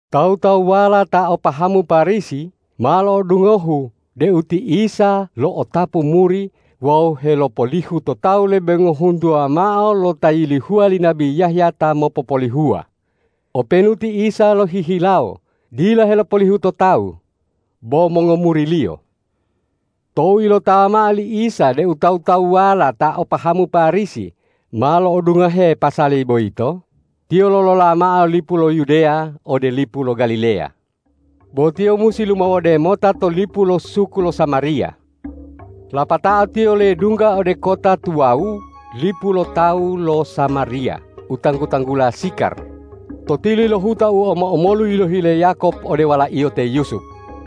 Tawu-tawuwala ta o pahamu Parisi ma lo'odungohu deu ti Isa lo'otapu muri wawu helopolihu to tawu lebe ngohuntuwa mao lo ta yilihuwa li nabi Yahya ta mopopolihuwa, openu ti Isa lohihilawo dila helopolihu to tawu, bo mongomuri-Liyo. Tou ilotawa mao li Isa deu tawu-tawuwala ta o pahamu Parisi ma lo'odungohe pasali boyito, Tiyo lolola mao lipu lo Yudeya ode lipu lo Galileya. Bo Tiyo musi lumawode mota to lipu lo suku lo Samariya. Lapatao Tiyo ledungga ode kota tuwawu lipu lo tawu lo Samariya u tanggu-tanggula Sikar, to tili lo huta u omo-omolu yilohi le Yakob ode walaiyo te Yusup.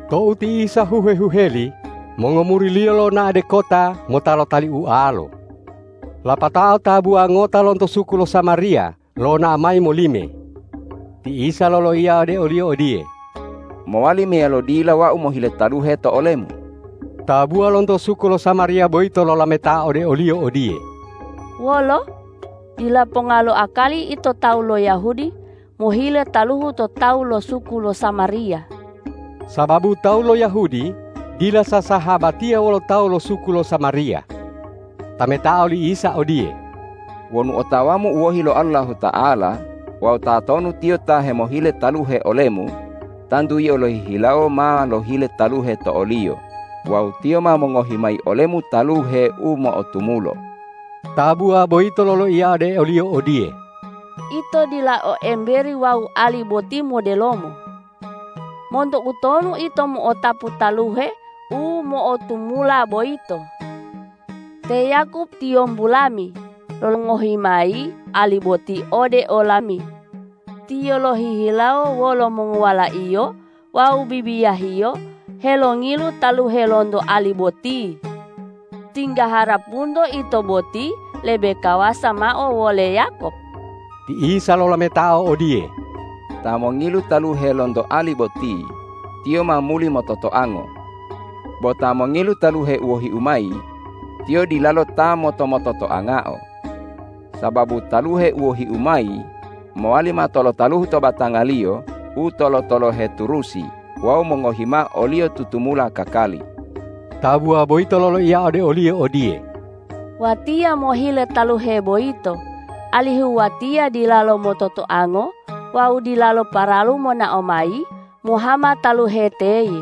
Tou ti Isa huhe-huheli, mongomuri-Liyo lonao de kota mota lotali ualo. Lapatao tabuwa ngota lonto suku lo Samariya lonao mayi molime. Ti Isa loloiya ode oliyo odiye,”Mowali meyalo dila Wau mohile taluhe to olemu?” Tabuwa lonto suku lo Samariya boyito lolametao ode o-Liyo odiye,”Wolo? Dila ponga lo akali Ito tawu lo Yahudi mohile taluhu to tawu lo suku lo Samariya.” Sababu tawu lo Yahudi dila sasahabatiya wolo tawu lo suku lo Samariya. Tametao li Isa odiye,”Wonu otawamu u wohi lo Allahuta'ala wawu tatonu Tiyo ta hemohile taluhe olemu, tantu yio lohihilawo ma lohile taluhe to o-Liyo wawu Tiyo ma mongohi mayi olemu taluhe u mo'otumulo.” Tabuwa boyito loloiya ode o-Liyo odiye,”Ito dila o emberi wawu ali boti modelomo. Monto utonu Ito mo'otapu taluhe u mo'otumula boyito? Te Yakob tiyombu lami, longohi mayi ali boti ode olami. Tiyo lohihilawo wolo mongowalaiyo wawu bibiyahiyo helongilu taluhe lonto ali boti. Tingga harapunto Ito boti lebe kawasa mao wole Yakob.” Ti Isa lolametao odiye,”Ta mongilu taluhe lonto ali boti, tiyo ma muli mototoango. Bo ta mongilu taluhe u wohi-U mayi, tiyo dilalo ta moto-mototoangao. Sababu taluhe u wohi-U mayi mowali mato lo taluhu to batangaliyo u tolo-tolohe turusi wawu mongohi mao oliyo tutumula kakali.” Tabuwa boyito loloiya ode o-Liyo odiye,”Watiya mohile taluhe boyito, alihu watiya dilalo mototoango wawu dilalo paralu monao mayi mohama taluhe teye.”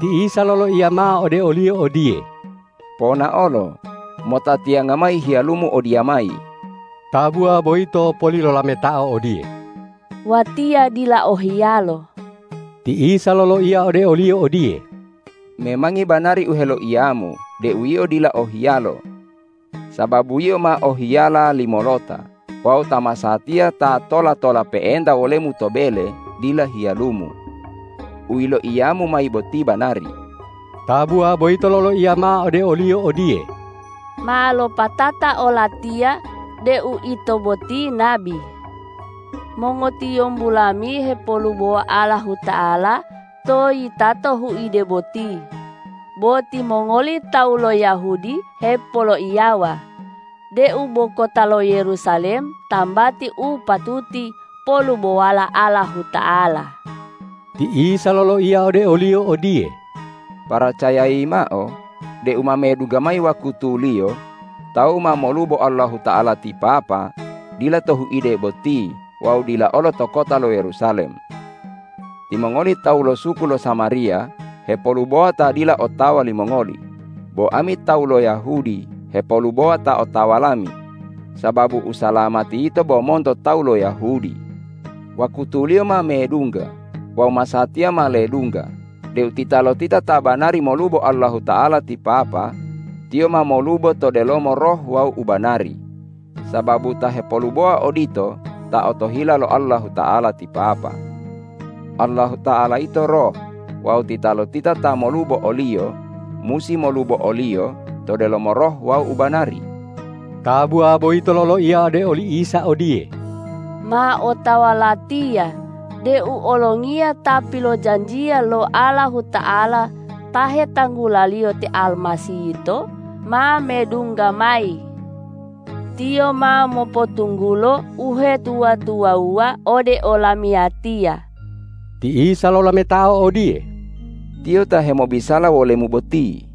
Ti Isa loloiya mao ode oliyo odiye,”Ponaolo, mota tiyanga mayi hiyalumu odiyamayi.” Tabuwa boyito poli lolametao odiye,”Watiya dila o hiyalo.” Ti Isa loloiya ode oliyo odiye,”Memangi banari u heloiyamu deu yio dila o hiyalo. Sababu yio ma o hiyala limolota wawu ta masatiya ta tola-tola pe'enta wolemu to bele dila hiyalumu. U yiloiyamu mayi boti banari.” Tabuwa boyito loloiya mao ode o-Liyo odiye,”Ma lopatata olatiya deu Ito boti nabi. Mongotiyombu lami hepolubowa Allahuta'ala to yitato huide boti, bo timongoli tawu lo Yahudi hepoloiyawa deu bo kota lo Yerusalem tambati u patuti polubowala Allahuta'ala.” Ti Isa loloiya ode oliyo odiye,”Paracayayi mao deu ma medungga mayi wakutuliyo, tawu ma molubo Allahuta'ala ti Papa dila to huide boti wawu dila olo to kota lo Yerusalem. Timongoli tawu lo suku lo Samariya hepolubowa ta dila otawa limongoli, bo ami tawu lo Yahudi hepolubowa ta otawa lami, sababu usalamati yito bo monto tawu lo Yahudi. Wakutuliyo ma medungga wawu masatiya ma ledungga deu titalotita ta banari molubo Allahuta'ala ti Papa, tiyo ma molubo to delomo roh wawu ubanari, sababu ta hepolubowa odito ta otohila lo Allahuta'ala ti Papa. Allahuta'ala yito Roh wawu titalotita ta molubo o-Liyo musi molubo o-Liyo to delomo roh wawu ubanari.” Tabuwa boyito loloiya ode oli Isa odiye,”Ma otawa latiya deu Olongiya ta pilojanjiya lo Allahuta'ala ta hetanggulaliyo te Almasih yito ma medungga mayi. Tiyo ma mopotunggulo uhetuwa-tuwawuwa ode olamiyatiya.” Ti Isa lolametao odiye,”Tiyo ta hemobisala wolemu boti.”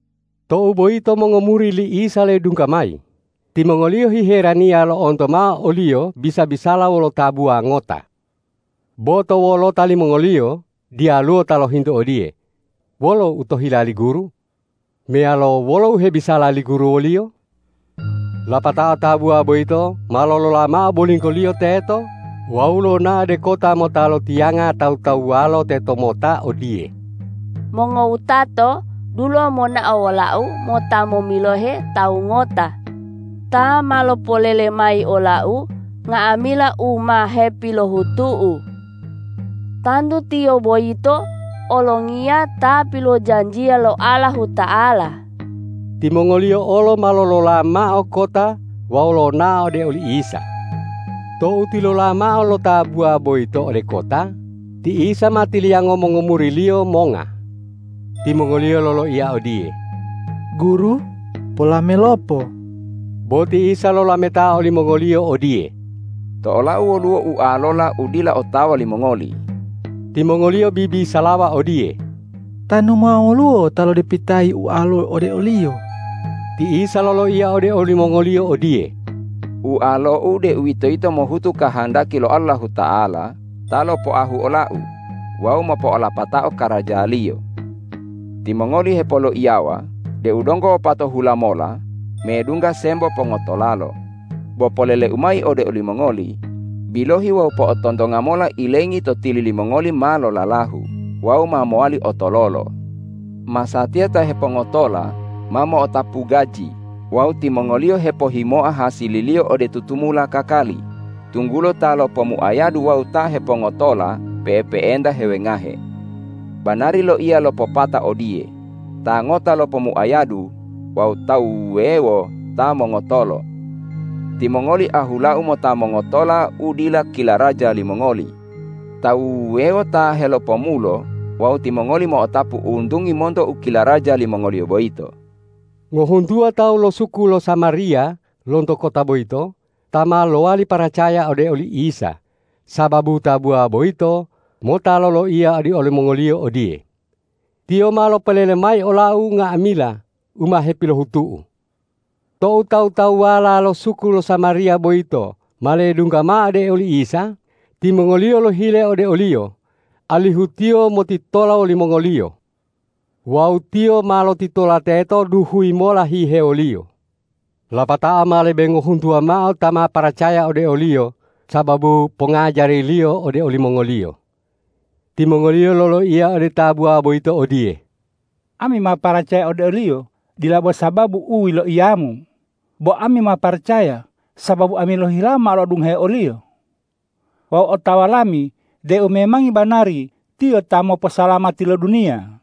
Tou boyito mongomuri li Isa ledungga mayi, timongoliyo hiheraniya lo'onto mao o-Liyo bisa-bisala wolo tabuwa ngota. Bo to wolota limongoliyo diyaluwo ta lohintu odiye: Wolo u otohila li Guru? Meyalo, wolo u hebisala li Guru woliyo? Lapatao tabuwa boyito ma lolola mao bolinggoliyo teto wawu lonao ode kota mota lotiyanga tawu-tawuwalo tetomota odiye, ”Mongowutato, dulo monao wolau mota momilohe Tawu ngota ta ma lopolele mayi olau nga'amila u ma hepilohutu'u. Tantu Tiyo boyito Olongiya ta pilojanjiya lo Allahuta'ala.” Timongoliyo olo ma lolola mao kota wawu lonao ode oli Isa. Tou tilola mao lo tabuwa boyito ode kota, ti Isa ma tiliyango mongomuri-Liyo monga. Timongoliyo loloiya odiye,”Guru, polamelopo.” Bo ti Isa lolametao olimongoliyo odiye,”To ola-U woluwo ualola u dila otawa limongoli.” Timongoliyo bibisalawa odiye,”Tanu ma woluwo ta lodepitayi ualo ode o-Liyo.” Ti Isa loloiya ode olimongoliyo odiye,”Ualo-U, deuwitoyito mohutu kahandaki lo Allahuta'ala ta lopoahu ola-U wawu mopo'olapatao karaja-Liyo. Timongoli hepoloiyawa deu donggo wopatohula mola medungga sembo pongotolalo. Bo polele-U mayi ode olimongoli: Bilohi wawu po'otontonga mola ilengi to tili limongoli ma lolalahu wawu ma mowali otololo! Masatiya ta hepongotola ma mo'otapu gaji wawu timongoliyo hepohimoa hasililiyo ode tutumula kakali, tunggulo ta lopomuayadu wawu ta hepongotola pe'epe'enta hewengahe. Banari loiya lo popata odiye, ’Ta ngota lopomuayadu wawu tawu wuwewo ta mongotolo.’ Timongoli ahula-U mota mongotola u dila kilaraja limongoli; tawu wuwewo ta helopomulo wawu timongoli mo'otapu untungi monto u kilaraja limongoliyo boyito.” Ngohuntuwa tawu lo suku lo Samariya lonto kota boyito ta ma lowali paracaya ode oli Isa sababu tabuwa boyito mota loloiya ode olimongoliyo odiye,”Tiyo ma lopolele mayi olau nga'amila u ma hepilohutu'u.” Tou tawu-tawuwala lo suku lo Samariya boyito ma ledungga mao ode oli Isa, timongoliyo lohile ode o-Liyo, alihu Tiyo motitola wolimongoliyo. Wawu Tiyo ma lotitola teto duhuyi mola hihewoliyo. Lapatao ma lebe ngohuntuwa mao ta ma paracaya ode o-Liyo sababu pongajari-Liyo ode olimongoliyo. Timongoliyo loloiya ode tabuwa boyito odiye,”Ami ma paracaya ode o-Liyo dila bo sababu u yiloiyamu, bo ami ma paracaya sababu ami lohihilawo ma lo'odungohe o-Liyo. Wawu otawa lami deu memangi banari Tiyo ta moposalamati lo duniya.”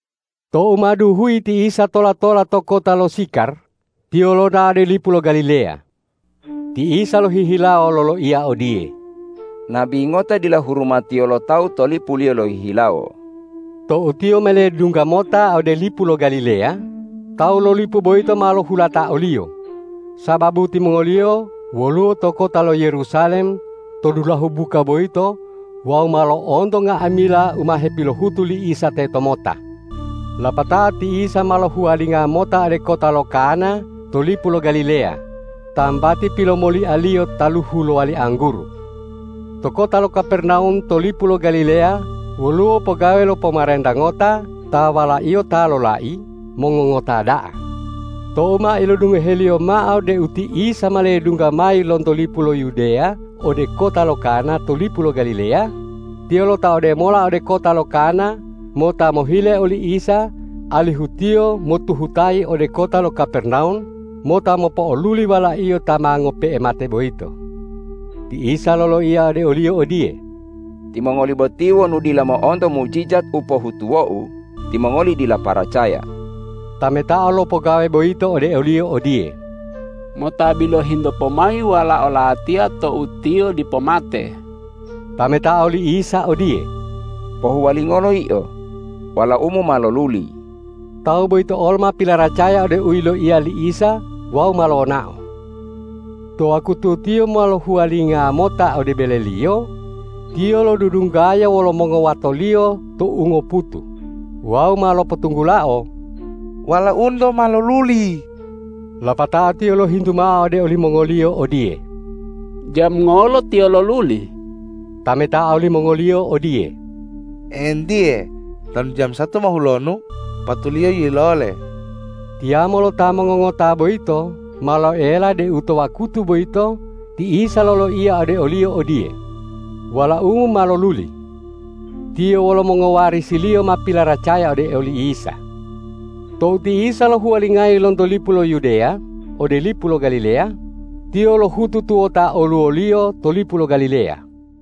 Tou ma duhuyi ti Isa tola-tola to kota lo Sikar, Tiyo lonao ode lipu lo Galileya. Ti Isa lohihilawo loloiya odiye,”Nabi ngota dila hurumatiyo lo tawu to lipuliyo lohihilawo.” Tou Tiyo ma ledungga mota ode lipu lo Galileya, tawu to lipu boyito ma lohulata o-Liyo, sababu timongoliyo woluwo to kota lo Yerusalem to dulahu buka boyito wawu ma lo'onto nga'amila u ma hepilohutu li Isa tetomota. Lapatao ti Isa ma lohuwalinga mota ode kota lo Kana to lipu lo Galileya, tambati pilomolia-Liyo taluhu lowali angguru. To kota lo Kapernawum to lipu lo Galileya woluwo pogawe lo pomarenta ngota ta walaiyo ta lolai mongongota da'a. Tou ma ilodungoheliyo mao deu ti Isa ma ledungga mayi lonto lipu lo Yudeya ode kota lo Kana to lipu lo Galileya, tiyo lotaode mola ode kota lo Kana mota mohile oli Isa alihu Tiyo motuhutayi ode kota lo Kapernawum mota mopo'oluli walaiyo ta ma ngope'e mate boyito. Ti Isa loloiya ode oliyo odiye,”Timongoli boti wonu dila mo'onto mujijat u pohutuwo-U, timongoli dila paracaya.” Tametao lo pogawe boyito ode o-Liyo odiye,”Mota bilohi-Nto pomayi walao latiya tou tiyo dipo mate.” Tametao li Isa odiye,”Pohuwalingolo yio. Walaumu ma loluli.” Tawu boyito olo ma pilaracaya ode u yiloiya li Isa wawu ma lonao. To wakutu tiyo ma lohuwalinga mota ode beleliyo, tiyo lodudunggaya wolo mongowatoliyo to ungoputu wawu ma lopotunggulao,”Walaunto ma loluli.” Lapatao tiyo lohintu mao ode olimongoliyo odiye,”Jamu ngolo tiyo loluli?” Tametao limongoliyo odiye,”Entiye, tanu jamu satu mohulonu patuliyo yilole.” Tiyamo lo ta mongongota boyito ma loela deu to wakutu boyito ti Isa loloiya ode oliyo odiye,”Walaumu ma loluli.” Tiyo wolo mongowarisiliyo ma pilaracaya ode oli Isa. Tou ti Isa lohuwalingayi lonto lipu lo Yudeya ode lipu lo Galileya, Tiyo lohutu tuwota oluwoliyo to lipu lo Galileya.